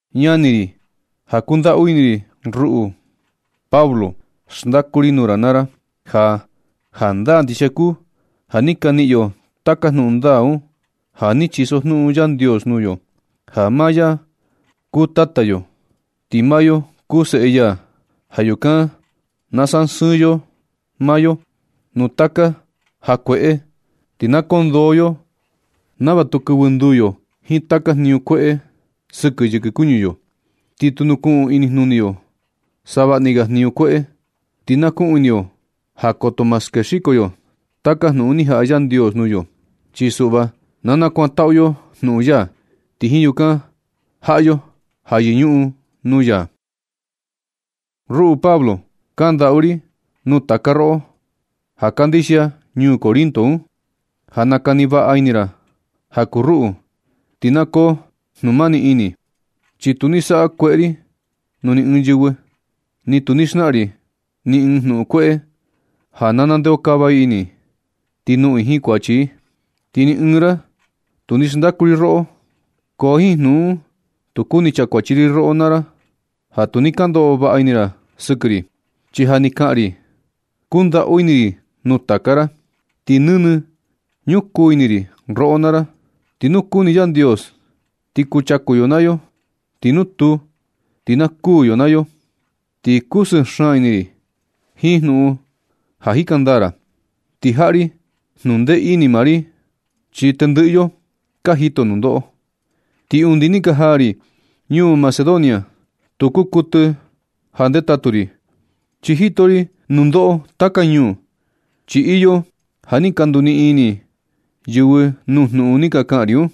Ñani ri ja kundaꞌu ini ri, ruꞌu Pablo, xndaku ri nuu ra naa ra ja jandaa ndixia kuu ja ni ka niꞌin yo taka jnuꞌun ndaa un ja ni chisojnuꞌun Yandios nuu yo, ja maa ya kuu Tata yo, ti maa yo kuu seꞌe ya. Ja yukan na sasɨɨn yo maa yo nuu taka ja kueꞌe ti na kondoo yo nava tu kɨvɨ nduu yo jiin taka jniñu sakueꞌe sɨkɨ yɨkɨ kuñu yo, ti tu kuꞌun inijnuni yo savaꞌni ga jniñu kueꞌe. Ti na kuꞌun ini yo ja koto ma skexiko yo taka jnuꞌun ni jaꞌa Yandios nuu yo. Chi suꞌva na kuantaꞌu yo jnuꞌun ya, ti jiin yukan jaꞌa yo ja yɨñuꞌun nuu ya. Ruꞌu Pablo, kandaꞌu ri nuu taka roꞌo ja kandixia ñuu Corinto un, ja na kani vaꞌa ini ra ja kuu ruꞌu, ti na koo jnumani ini. Chi tu ni saꞌa kueꞌe ri nuu ni ɨɨn yɨvɨ. Ni tu ni xnaꞌan ri ni ɨɨn jnuꞌun kueꞌe ja na nandeokava ini i, ti noꞌon i jiin kuachi. Ti ni ɨɨn ra tu ni xndaꞌu ri roꞌo. Ko jiin jnuꞌun un tu kuni chakuachi ri roꞌo naa ra ja tu ni ka ndoꞌo vaꞌa ini ra sɨkɨ ri. Chi ja ni kaꞌan ri ja kundaꞌu ini ri nuu taka ra. Ti nɨnɨ ñukuu ini ri roꞌo naa ra, ti nu kuni Yandios ti kuchaku yo naa yo, ti nu tuu, ti na kuū yo naa yo. Ti chundee xaan ini ri ti kusɨɨ xaan ini ri jiin jnuꞌun ja ka jika ndaa ra, ti jaꞌa ri jnundee ini maa ri, chi tendɨꞌɨ yo ka jito nundoꞌo. Ti undi ni ka jaa ri ñuu Macedonia, tu kuu kuɨtɨ ja ndetatu ri, chi jito ri nundoꞌo taka ñuu. Chi iyo ja ni ka nduniꞌin ini yɨvɨ nuu jnuꞌun ni kaꞌan ri un.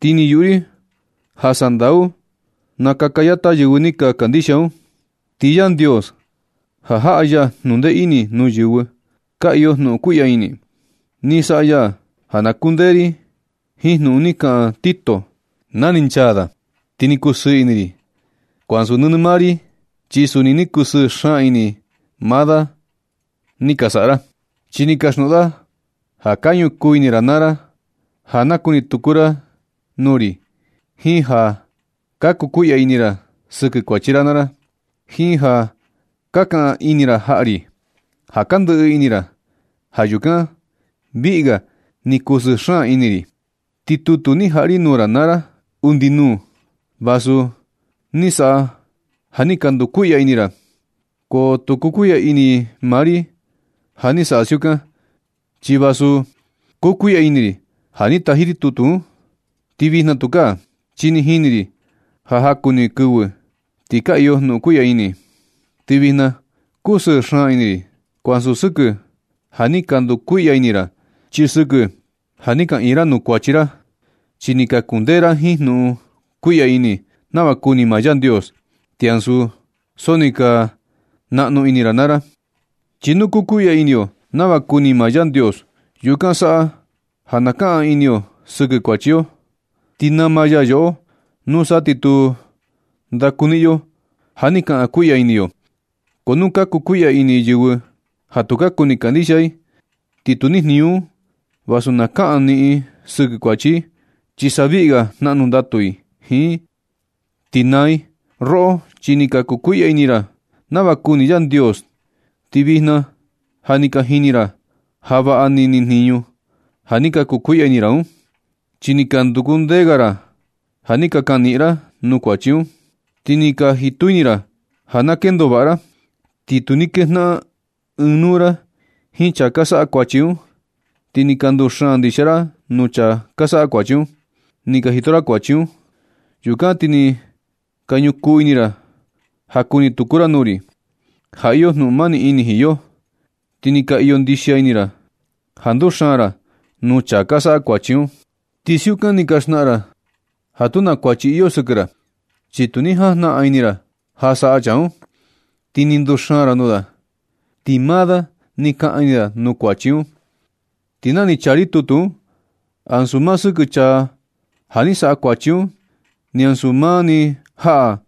Ti ni yuꞌu ri ja sandau naa kaka yata yɨvɨ ni ka kandixia un. Ti Yandios ja jaꞌa ya jnundee ini nuu yɨvɨ, ka iyo jnuꞌun kuiꞌya ini. Ni saꞌa ya ja naa kundee ini ri jiin jnuꞌun ni kaꞌan Tito na ni nchaa da. Ti ni kusɨɨ ini ri, ko ansu nɨnɨ maa ri, chi suni ni kusɨɨ xaan ini maa da ni ka saꞌa ra. Chi ni kasjnuꞌun da ja ka ñukuu ini ra naa ra ja na kuni tuku ra nuu ri, jiin ja ka kukuiꞌya ini ra sɨkɨ kuachi ra naa ra, jiin ja ka kaꞌan ini ra jaꞌa ri ja ka ndɨꞌɨ ini ra. Ja yukan viꞌi ga ni kusɨɨ xaan ini ri. Ti tutu ni taji ri nuu ra naa ra undi nuu, vasu ni saꞌa ja ni ka ndukuiꞌya ini ra, ko tu kukuiꞌya ini maa ri ja ni saꞌa siukan. Chi vasu kukuiꞌya ini ri na ni taji ri tutu un, ti vijna tukaa, chi ni jini ri ja jaku ni kɨvɨ ni ka iyo jnuꞌun kuiꞌya ini. Ti vijna kusɨɨ xaan ini ri, ko ansu sɨkɨ ja ni ka ndukuiꞌya ini ra, chi sɨkɨ ja ni kaꞌan ini ra nuu kuachi ra. Chi ni ka kundee ra jiin jnuꞌun kuiꞌya ini nava kuni maa Yandios, ti ansu so ni ka naꞌnu ini ra naa ra. Chi nu kukuiꞌya ini yo nava kuni maa Yandios, yukan saꞌa ja na kaꞌan ini yo sɨkɨ kuachi yo, ti nama ya yoꞌo. Nusa ti tu ndakuniꞌin yo ja ni kaꞌan kuiꞌya ini yo. Ko nu ka kukuiꞌya ini yɨvɨ ja tu ka kuni kandixia i, ni tu ni jniñu un vasu naa kaꞌan ini i sɨkɨ kuachi i, chi sa viꞌi ga jnaꞌnu ndatu i jiin un ti naa i. Roꞌo, chi ni ka kukuiꞌya ini ra nava kuni Yandios, ti vijna ja ni ka jini ra ja vaꞌa ni nijniñu ja ni ka kukuiꞌya ini ra un. Chi ni ka nduku ndee ga ra ja ni ka kaꞌan ini ra nuu kuachi un. Ti ni ka jitu ini ra ja na kendo vaꞌa ra, ti tu ni kejnaꞌan ɨɨn nuu ra jiin chaa ka saꞌa kuachi un. Ti ni ka nduxaan ndixia ra nuu chaa ka saꞌa kuachi un, ni ka yuꞌu ra ni ka jito ra kuachi un. Yukan ti ni ka ñukuu ini ra ja kuni tuku ra nuu ri, ja iyo jnuꞌun mani ini jiin yo. Ti ni ka iyo ndixia ini ra ja nduxaan ra nuu chaa ka saꞌa kuachi un. Ti siukan ni ka xnaꞌan ra ja tu na kuachi iyo sɨkɨ ra, chi tu ni jajnaꞌan ini ra ja saꞌa chaa un, ti ni nduxaan ra nuu da, ti maa da ni kaꞌan ini da nuu kuachi da un. Ti na ni chaa ri tutu un, ansu maa ni sɨkɨ chaa ja ni saꞌa kuachi un, ni ansu maa ni jaꞌa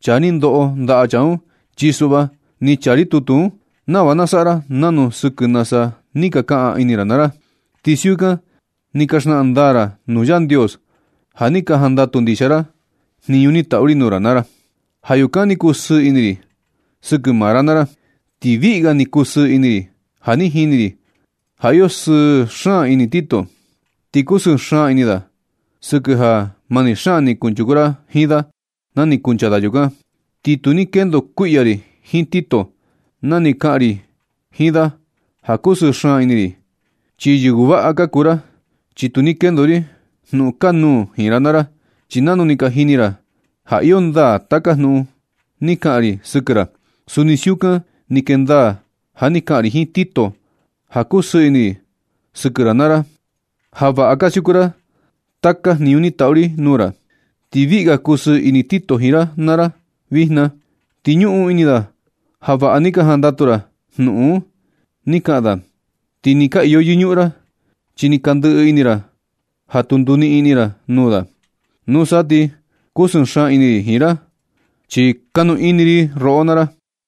chaa ni ndoꞌo ndaꞌa chaa un. Chi suꞌva ni chaa ri tutu un nava na saꞌa ra nanu sɨkɨ nasa ni ka kaꞌan ini ra naa ra, ti siukan ni ka xnaꞌan ndaa ra nuu Yandios ja ni ka jandatu ndixia ra jniñu ni taꞌu ri nuu ra naa ra. Ja yukan ni kusɨɨ ini ri sɨkɨ maa ra naa ra. Ti viꞌi ga ni kusɨɨ ini ri ja ni jini ri ja iyo sɨɨ xaan ini Tito. Ti kusɨɨ xaan ini da sɨkɨ ja mani xaan ni kunchuku ra jiin da na ni kuncha da yukan. Ti tu ni kendo kuiꞌya ri jiin Tito na ni kaꞌan ri jiin da ja kusɨɨ xaan ini ri, chi yɨvɨ vaꞌa ka kuu ra, chi tu ni kendo ri jnuꞌun kanuū jiin ra naa ra. Chi nanu ni ka jini ra ja iyo ndaa taka jnuꞌun ni kaꞌan ri sɨkɨ ra, suni siukan ni kee ndaa ja ni kaꞌan ri jiin Tito ja kusɨɨ ini ri sɨkɨ ra naa ra, ja vaꞌa ka siukun ra taka jniñu ni taꞌu ri nuu ra. Ti viꞌi ga kusɨɨ ini Tito jiin ra naa ra vijna, ti ñuꞌun ini da ja vaꞌa ni ka jandatu ra jnuꞌun ni kaꞌan da. Ti ni ka iyo yɨñuꞌun ra, chi ni ka ndɨꞌɨ ini ra ja tu nduniꞌin ini ra nuu da. Nusa ti kusɨɨ xaan ini ri jiin ra, chi kanu ini ri roꞌo naa ra.